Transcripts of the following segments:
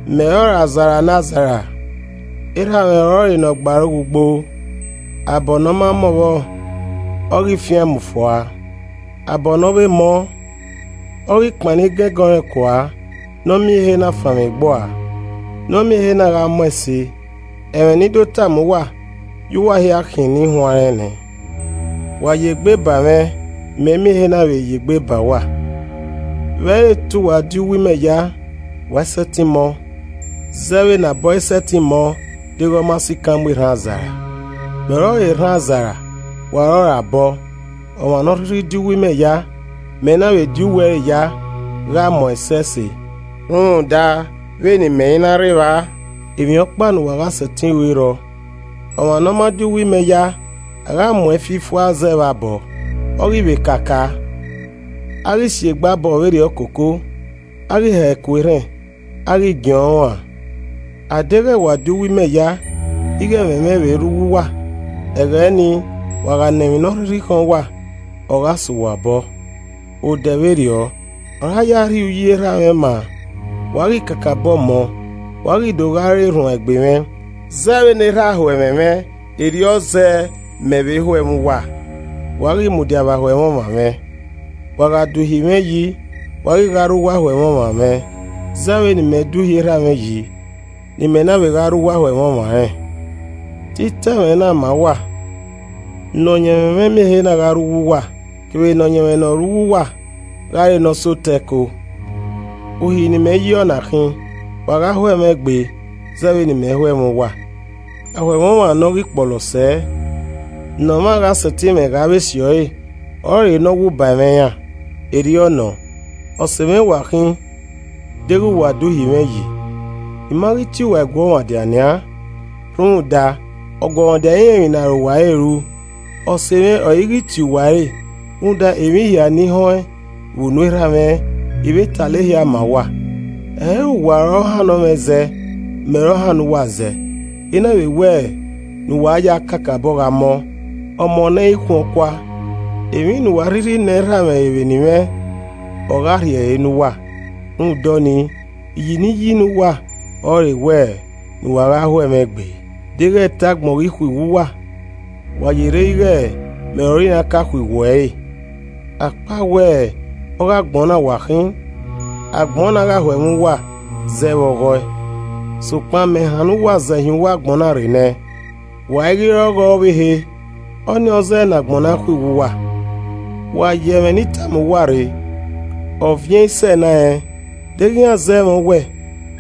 “Mẹ ọrọre azara ne azara, Erha mwẹ ọrọre ne ọ gbe aro ghe ugbo. Abọ ne ọma mọ vbọ, ọ ghi fiaẹn mu fua, abọ ne ovbe mọ, ọ ghi kpannọ igẹngẹn ọnrẹn kua ne ọ miẹn ehe na fanmwegbua, nọ miẹn ehe na gha mọ ẹse. Ẹmwẹ ne I do tama uwa ya uwa hia khian ni huanrẹn nẹ. Wa ya egbe ba mwẹ ne imẹ miẹn ehe na vbe ya egbe ba uwa. Vbe ẹ i re te uwa di uwu imẹ ya, wa i sẹtin mọ, zẹ vbe ne abọ i sẹtin mọ deghẹ ọ ma sikan mu erhan azara. “Mẹ ọrọre erhan azara, wa ọrọre abọ. Ọmwa ne ọ rhirhi di uwu imẹ ya, mẹ na vbe di uwu ẹre ya, gha mọ ẹsẹse, rhunmwuda vbe ne imẹ i na rre evba, emwi ọkpa ne uwa gha sẹtin ru i rrọọ. Ọmwa ne ọ ma di uwu imẹ ya, a gha mu ẹn fi fua zẹ vbe abọ, ọ ghi vbe kaka, a gha si egbe abọ vberriọ koko, a ghi hẹ ku erhẹn, a ghi giẹn ọnrẹn uan. A deghẹ wa di uwu imẹ ya, ighẹ ẹmwẹ mwẹ vbe rre uwu uwa, ẹghẹ ni, wa gha nọ emwi ne ọ rhirhi khọn uwa, ọ gha sẹ uwa obọ. Odẹ vberriọ ọre a ya rhie uyi Erha mwẹ maa, wa ghi kakabọ mọ, wa ghi do gha re erhuanegbe mwẹ. Zẹ vbene Erha ho ẹmwẹ mwẹ, erriọ zẹẹ mẹ vbe ho ẹmwẹ uwa, wa ghi mudia vbe ahoẹmwọmwa mwẹ. Wa gha da uhi mwẹ yi, wa ghi gha rre uwu ahoẹmwọmwa mwẹ zẹ vbene imẹ da uhi Erha mwẹ yi ne imẹ na vbe gha rre uwu ahoẹmwọmwa rẹn. “Te I ta ẹmwẹ na ma uwa ne ọyẹnmwẹ mwẹ miẹn ehe na gha rre uwu uwa kevbe ne ọyẹnmwẹ ne ọ rre uwu uwa gha re ne ọ sẹ otọ ẹko. Uhi ne imẹ yi ọna khin: Wa gha ho ẹmwẹ egbe zẹ vbene imẹ ho ẹmwẹ uwa. Ahoẹmwọmwa ne ọ ghi kpọlọ sẹ, ne ọmwa gha sẹtin mwẹ ghe avbe esiọre ọrọre ne ọ wu ba ẹmwẹ iran. Erriọ nọ, ose mwẹ wa khin deghẹ wa da uhi mwẹ yi. I ma ghi tie uwa eguọmwadia nian rhunmwuda ọguọmwadia i rẹn emwi ne arowa ẹre ru. Ọse mwẹ ọre I ghi tie uwa ẹre rhunmwuda emwi hia ne I họẹn vbe unu Erha mwẹ, I vbe talọ ehia ma uwa. Ẹ i re uwa ọre ọ hannọ mwẹ zẹ, mẹ ọre ọ hannọ uwa zẹ, I na vbe wẹ ne uwa ya kakabọ gha mọ, ọmọ ne ẹ i khuọn kua. Emwi ne uwa a rhirhi nọ Erha re vbe eni mwẹ, ọ gha rhie ẹre ne uwa. Rhunmwuda ọnii, iyi ne I yi ne uwa ọrọre wẹ ne uwa gha ho ẹmwẹ egbe. “Deghẹ te agbọn ghi khuiwu uwa, wa yerre ighe mẹ ọre iran ka khuiwu ẹre. Akpawẹ ọghe agbọn na uwa khin, agbọn na gha ho ẹmwẹ uwa zẹ vbe ọghe ẹe. Sokpan mẹ hannọ uwa zẹ hin uwu agbọn na rre nẹ, wa i ghi vbe re ọghe ẹe ọvbehe, ọnii ọ zẹẹ ne agbọn na khuiwu uwa. Wa ye ẹmwẹ ne I tama uwa rre, ‘Ọviẹn i sẹ enarẹn,’ Deghẹ iran zẹ mwẹ owẹ,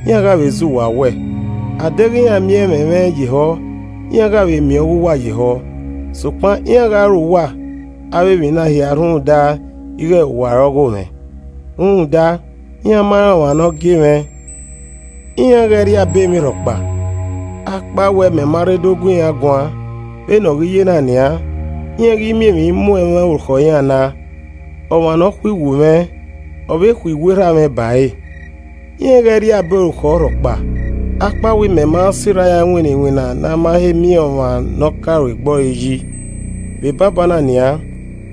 iran gha vbe zẹ uwa owẹ. Adeghẹ iran miẹn ẹmwẹ mwẹ ye ehọ, iran gha vbe miẹn ọghe uwa ye ehọ. Sokpan iran gha ru uwa avbe emwi na hia rhunmwuda ighe uwa re ogho mwẹ, rhunmwuda iran ma rẹn ọmwa ne ọ gie mwẹ. Iran ghẹ i rri abe emwi rhọkpa akpawẹ mẹ ma rre do gu iran guan, vbene ọ ghi ye na nian, iran i ghi miẹn emwi mu ẹmwẹ orukhọ iran na. Ọmwa ne ọ khuiwu mwẹ, ọ vbe khuiwu Erha mwẹ ba ẹre. Iran i ghẹ rri abe orukhọ rhọkpa akpawẹ mẹ ma sirra iran winna iwinna ne a ma he miẹn ọmwa ne ọ ka ru egbe ọre yi, vbe banbanna nian,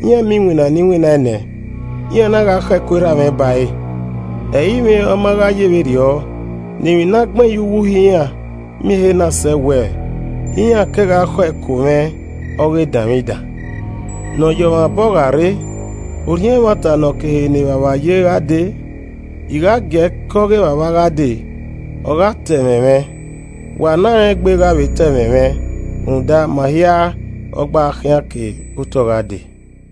iran miẹn iwinna ne I winnaẹn nẹ, iran na gha khọ ẹko Erha mwẹ bare. Ẹ i mwẹ ọ ma gha ye vberriọ, ne emwi ne a gbẹn ye uwu Uhi iran miẹn ehe na sẹ wẹẹ, ‘Iran kegha khọ ẹko mwẹ ọghe edanmwidan!’ “Ne ọ yọ ọmwa obọ gha rre — Orhiọn Ẹmwata ne ọ ke ehe ne Evbavba ye gha dee, I gha giee ke ọghe Evbavba gha dee, ọ gha ta ẹmwẹ mwẹ. Wa ne arẹngbe gha vbe ta ẹmwẹ mwẹ rhunmwuda ma hia ọ gba gha khian ke otọ gha dee.”